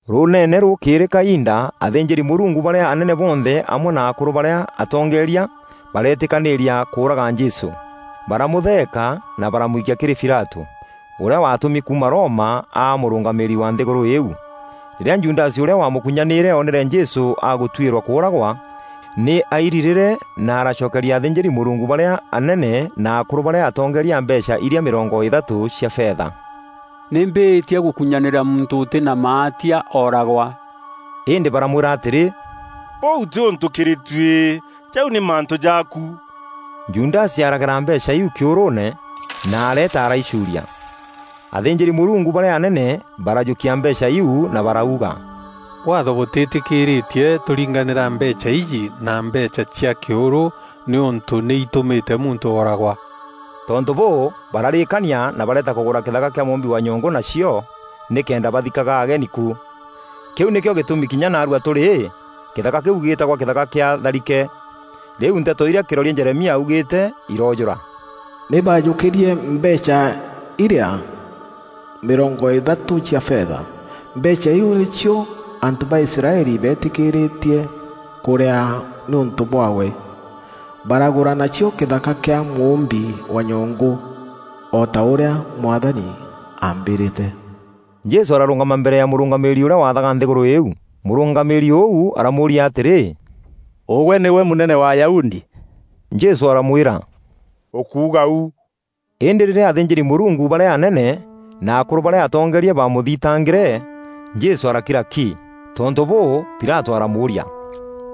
Rûûneene rûkîîrî kainda athînjîri-Mûrungu barîa anene bonthe amwe na akûrû barîa atongeeria bareetîkanîîria kûûraga Jesû. Baramûtheeka na baramwikia kîrî Pilatû, ûrîa waatûmi kuuma Roma aa mûrûngamîîri wa nthîgûrû îîu. Rîrîa Judasi ûrîa wamûkûnyanîîre oonere Jesû agûtuîrwa kûûragwa, nî airirîre na aracokeria athînjîri-Mûrungu barîa anene na akûrû barîa atongeeria mbeecha irîa mîrongo îthatû cia fetha. “Nî mbîîtie gûkunyanîra muntû ûtî na maatia ooragwa.” Îndî baramwîra atîrî, “Bûu tî ûntû kîrî tuî! Jau nî mantû jaaku.” Judasi aragera mbeecha iu kîûrûûne, na areeta araicuuria. Athînjîri-Mûrungu barîa anene barajûkia mbeecha iu na barauga, “Waatho bûtîtîkîîrîtie tûringanîra mbeecha iji na mbeecha cia kîûrû nîûntû nî itûmîte muntû ooragwa.” Tontû bûû, bararîîkania na bareeta kûgûra kîthaka kîa mûûmbi wa nyongû nacio nîkenda bathikaga ageni ku. Kîu nîkîo gîtûmi kinya naarua tûrî, kîthaka kîu gîtagwa Kîthaka kîa Tharike. Rîu nteto irîa kîroria Jeremia augîîte iroojûra: “Nî baajûkîrîe mbeecha irîa mîrongo îthatû cia fetha. Mbeecha iu nîcio antû ba Israeli beetîkîîrîtie kûrîaa nîûntû bwaawe. Baragûra nacio kîthaka kîa mûûmbi wa nyongû o ta ûrîa Mwathani aambîrîte.” Jesû ararûngama mbere ya mûrûngamîîri ûrîa waathaga nthîgûrû îîu. Mûrûngamîîri ûu aramûûria atîrî, “Ûgwe nîgwe mûnene wa Ayahudi?” Jesû aramwîra, “Ûkuuga u.” Îndî rîrîa athînjîri-Mûrungu barîa anene na akûrû barîa atongeeria baamûthitangîre, Jesû arakira ki. Tontû bûû, Pilatû aramûûria,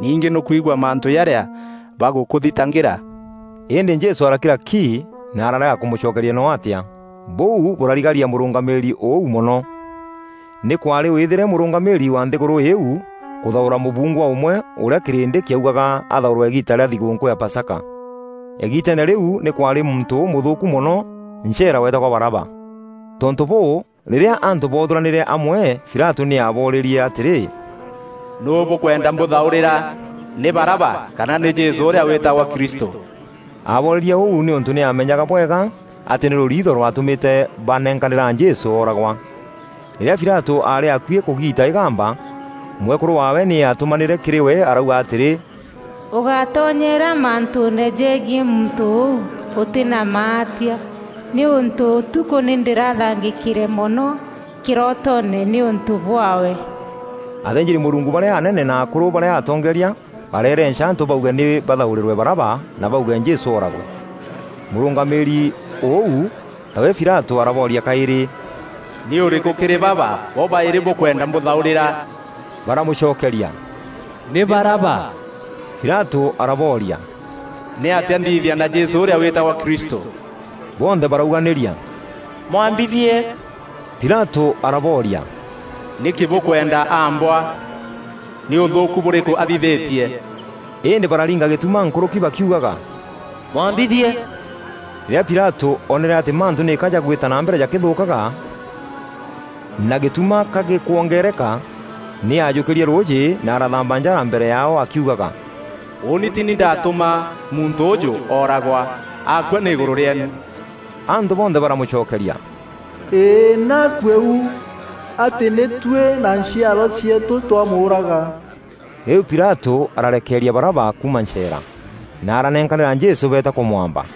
“Ningî nî ûkwigua mantû jarîa bagûkûthitangîra?” Îndî Jesû arakira ki na ararega kûmûcokeria noo atîa. Bûu bûrarigaria mûrûngamîîri ûu mono. Nî kwaarî wîîthîre mûrûngamîîri wa nthîgûrû îîu kûthaûra mûbungwa ûmwe ûrîa kîrîndî kîaugaga athaûrwe îgiita rîa thîgûûnkû ya Pasaka. Îgiiteene rîu nî kwaarî muntû ûmûthûûku mono ncheera weetagwa Baraba. Tontû bûû, rîrîa antû boothûranîre amwe, Pilatû nî aaboorîrie atîrî, “Nûû bûkûenda mbûthaûrîra: Nî Baraba kana nî Jesû ûrîa wîtagwa Kristû?” Aboorîrie ûu nîûntû nî aamenyaga bwega atî nî rûriitho rwatûmîte banenkanîra Jesû ooragwa. Rîrîa Pilatû aarî akuî kûgiita îgamba, mwekûrû waawe nî aatûmanîre kîrî we arauga atîrî, “Ûgátonyeera mantûûne jegiî muntû ûu ûtî na maatia, nîûntû ûtukû nî ndîrathangîkîre mono kîrootoone nîûntû bwaawe.” Athînjîri-Mûrungu barîa anene na akûrû barîa atongeeria bareerenca antû bauge nî bathaûrîrwe Baraba na bauge Jesû ooragwe. Mûrûngamîîri ûu, tawe Pilatû arabooria kaîrî, “Nî ûrîkû kîrî baba bobaîrî bûkwenda mbûthaûrîra?” Baramûcokeria, “Nî Baraba!” Pilatû arabooria, “Nî atîa nthithia na Jesû ûrîa wîtagwa Kristû?” Bonthe barauganîria, “Mwambithie!” Pilatû arabooria, “Nîkî bûkwenda aambwa? Nî ûthûûku bûrîkû athithîtie?” Îndî bararinga gîtuma nkûrûki bakiugaga, “Mwambithie!” Rîrîa Pilatû oonere atî mantû nîka jagwîta na mbere jakîthûûkaga, na gîtuma ka gîkwongeereka, nî aajûkîrie rûûjî na arathamba njara mbere yaao akiugaga, “Ûûni tî ni ndaatûma muntû ûûjû ooragwa, akua nî îgûrû rîeenu!” Antû bonthe baramûcokeria, “Îî, nî akuee u atî nî tuî na nchiarwa cieetû twamûûraga!” Rîu Pilatû arareekeria Baraba kuuma ncheera, na aranenkanîra Jesû beeta kûmwamba.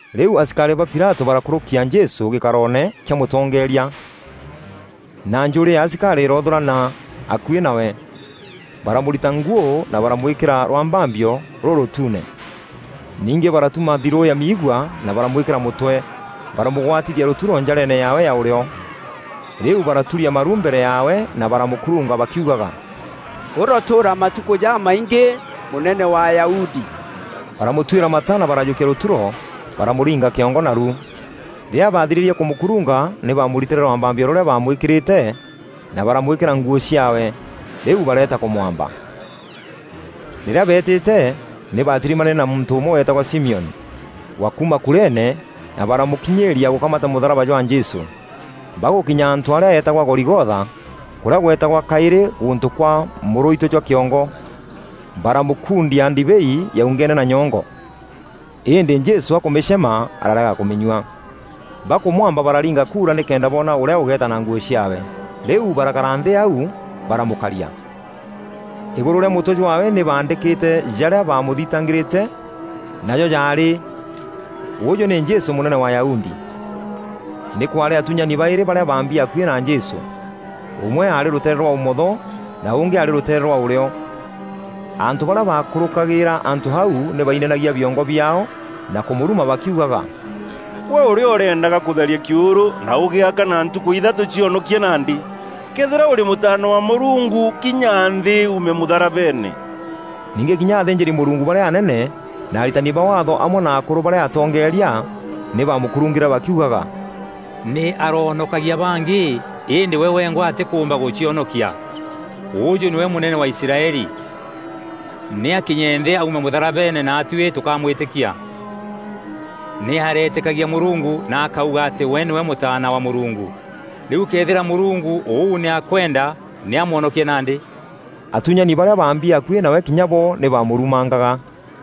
Rîu asikarî ba Pilatû barakûrûkia Jesû gîkaroone kîa mûtongeeria, na njûûrî ya asikarî îroothûûrana akuî nawe. Baramûrita nguû na baramwîkîra rwambambio rûrûtuune. Ningî baratuma thirû ya miigua na baramwîkîra mûtwe, baramûgwatithia rûturo njareene yaawe ya ûrîo. Rîu baraturia maru mbere yaawe na baramûkurunga bakiugaga, “Ûrotûûra matukû jamaingî Mûnene wa Ayahudi!” Baramûtuîra mata na barajûkia rûturo baramûringa kîongo naru. Rîrîa baathirîrie kûmûkurunga nî baamûritîre rwambambio rûrîa baamwîkîrîte, na baramwîkîra nguû ciaawe. Rîu bareeta kûmwamba. Rîrîa beetîte, nî baatirimanîre na muntû ûmwe weetagwa Simioni, wa kuuma Kurene na baramûkinyîîria gûkamata mûtharaba jwa Jesû. Bagûkinya antû arîa eetagwa Goligotha, kûrîa gweetagwa kaîrî “Gûntû kwa mûrûitû jwa kîongo,” baramûkundia ndibei yaungenue na nyongo. Îndî Jesû akûmîcema ararega kûmînyua. Bakûmwamba bararinga kuura nîkenda boona ûrîa ûgeeta na nguû ciaawe. Rîu barakara nthî au, baramûkaria. Îgûrû rîa mûtwe jwaawe nî baandîkîte jarîa baamûthitangîrîte, najo jaarî, “Ûjû nî Jesû Mûnene wa Ayahudi.” Nî kwaarî atuunyani baîrî barîa baambi akuî na Jesû, ûmwe aarî rûteere rwa ûmotho na ûngî aarî rûteere rwa ûrîo. Antû barîa baakûrûkagîîra antû au nî bainainagia biongo biaao na kûmûruma bakiugaga, “Gwe ûrîa ûreendaga kûtharia kîûrû na ûgîaka na ntukû ithatû, cionokie nandî! Këethîra ûrî Mûtaana wa Mûrungu, kinya nthî uume mûtharabeene!” Ningî kinya athînjîri-Mûrungu barîa anene na aritani ba Waatho amwe na akûrû barîa atongeeria, nî baamûkurungîre bakiugaga, “Nî aroonokagia bangî îndî we wengwa atîkûûmba gûcionokia! Ûjû nîwe Mûnene wa Israeli! Nî aakinye nthî aume mûtharabeene naatuî tûkamwîtîkia! Nî areetîkagia Mûrungu na akauga atî we nîwe Mûtaana wa Mûrungu, rîu këethîra Mûrungu ûu nî akwenda nî amwonokie nandî.” Atuunyani barîa baambi akuî nawe kinya bo nî baamûrumangaga.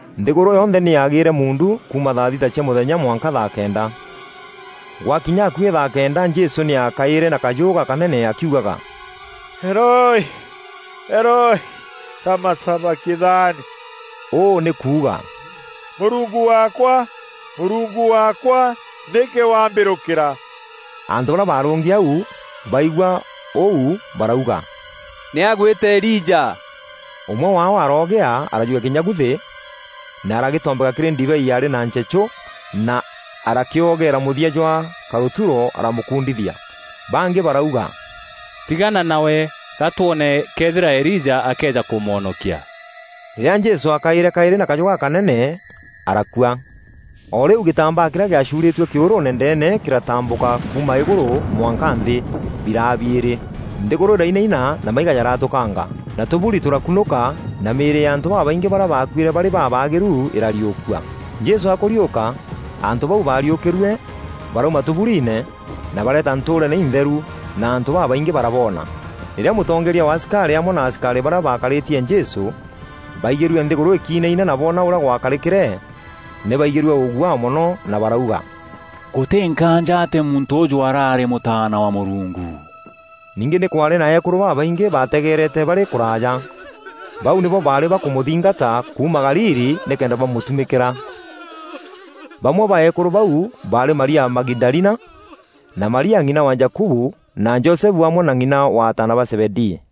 Nthîgûrû yonthe nî yaagîîre muundu kuuma thaa thita cia mûthenya mwanka thaa kenda. Gwakinya akuî thaa kenda Jesû nî aakaîre na kajû gakanene akîugaga: “Eloi, Eloi, lama Sabakithani?” Ûû nî kuuga, “Mûrungu waakwa, Mûrungu waakwa, nîkî wambîrûkîra?” Antû barîa barûngi au baigua ûu barauga, “Nî agwîta Elija.” Ûmwe waao aroogîa arajûkia kînyaguthi, na aragîtombeka kîrî ndibei yaarî na nchechû na arakîogera mûthia jwa karûturo na aramûkundithia. Bangî barauga, “Tigana nawe, ga twoone këethîra Elija akeeja kûmwonokia.” Rîrîa Jesû aakaîre kaîrî na kajû gakanene, arakua. O rîu gîtambaa kîrîa gîacuurîîtue kîûrûûne ndeene kîratambûka kuuma îgûrû mwanka nthî, biraa biîrî. Nthîgûrû îrainaina na maiga jaratûkanga, na tûbûri tûrakunûka na mîîrî ya antû babaingî barîa baakuîre barî babaagîru îrariûkua. Jesû akûriûka, antû bau baariûkîrue barauma tûbûriine, na bareeta ntûûreene întheru, na antû babaingî baraboona. Rîrîa mûtongeeria wa asikarî amwe na asikarî barîa baakarîtie Jesû, baigîrue nthîgûrû îkinaina na boona ûrîa gwakarîkîre, nî baigîrue ûguaa mono na barauga, “Gûtî nkaanja atî muntû ûûjû araarî Mûtaana wa Mûrungu.” Ningî nî kwaarî na eekûrû babaingî baategerete barî kûraaja. Bau nîbo baarî bakûmûthingata kuuma Galili nîkenda bamûtumîkîra. Bamwe ba eekûrû bau baarî Maria Magidalina, na Maria ng'ina wa Jakubu na Josefu amwe na ng'ina wa ataana ba Zebedii.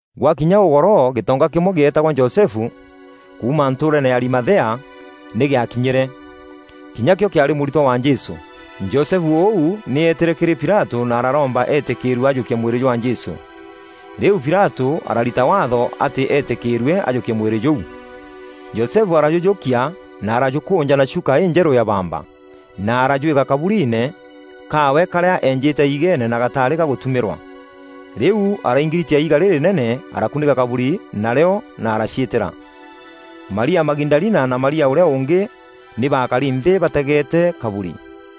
Gwakinya ûgoro gîtonga kîmwe gîetagwa Josefu, kuuma ntûûreene ya Arimathea, nî gîaakinyîre. Kinya kîo kîaarî mûritwa wa Jesû. Josefu ûu nî eetîre kîrî Pilatû na araromba eetîkîîrue ajûkie mwîrî jwa Jesû. Rîu Pilatû ararita waatho atî eetîkîîrue ajûkie mwîrî jûu. Josefu arajûjûkia na arajûkûûnja na chuka înjerû ya bamba, na arajwîka kabûriine kaawe karîa eenjîte iigeene na gatarî gagûtumîrwa. Rîu araingiritia iiga rîrînene arakûnîka kabûri narîo na araciîtîra. Maria Magidalina na Maria ûrîa ûngî nî baakari nthî bategeete kaburi.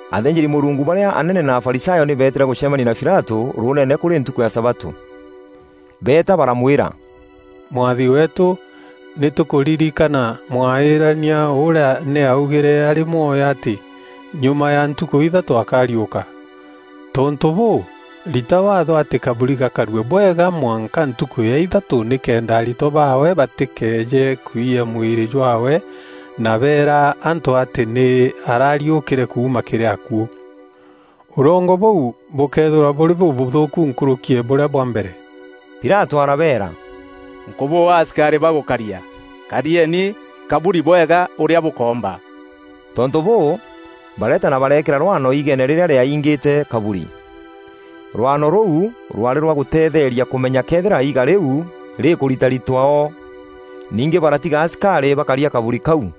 Athînjîri-Mûrungu barîa anene na Afarisayo nî beetîre gûcemania na Pilatû, rûûnene, kûrî ntukû ya sabatû. Beeta baramwîra, “Mwathi weetû, nî tûkûririkana mwaaîrania ûrîa nî aaugîre aarî mwoyo atî, ‘Nyuma ya ntukû ithatû akariûka.’ Tontû bûû, rita waatho atî kaburi gakarue bwega mwanka ntukû ya ithatû nîkenda aritwa baawe batîkeeje kwiya mwîrî jwaawe na beera antû atî nî arariûkîre kuuma kîrî akuû. Ûrongo bûu bûkeethîrwa bûrî bûbûthûûku nkûrûki ya bûrîa bwa mbere.” Pilatû arabeera, “Nkûbûa asikarî ba gûkaria; karieni kaburi bwega ûrîa bûkoomba.” Tontû bûû, bareeta na bareekîra rwaano iigeene rîrîa rîaingîte kaburi. Rwaano rûu rwarî rwa gûteetheeria kûmenya këethîra iiga rîu rîkûritaritwa o. Ningî baratiga asikarî bakaria kaburi kau.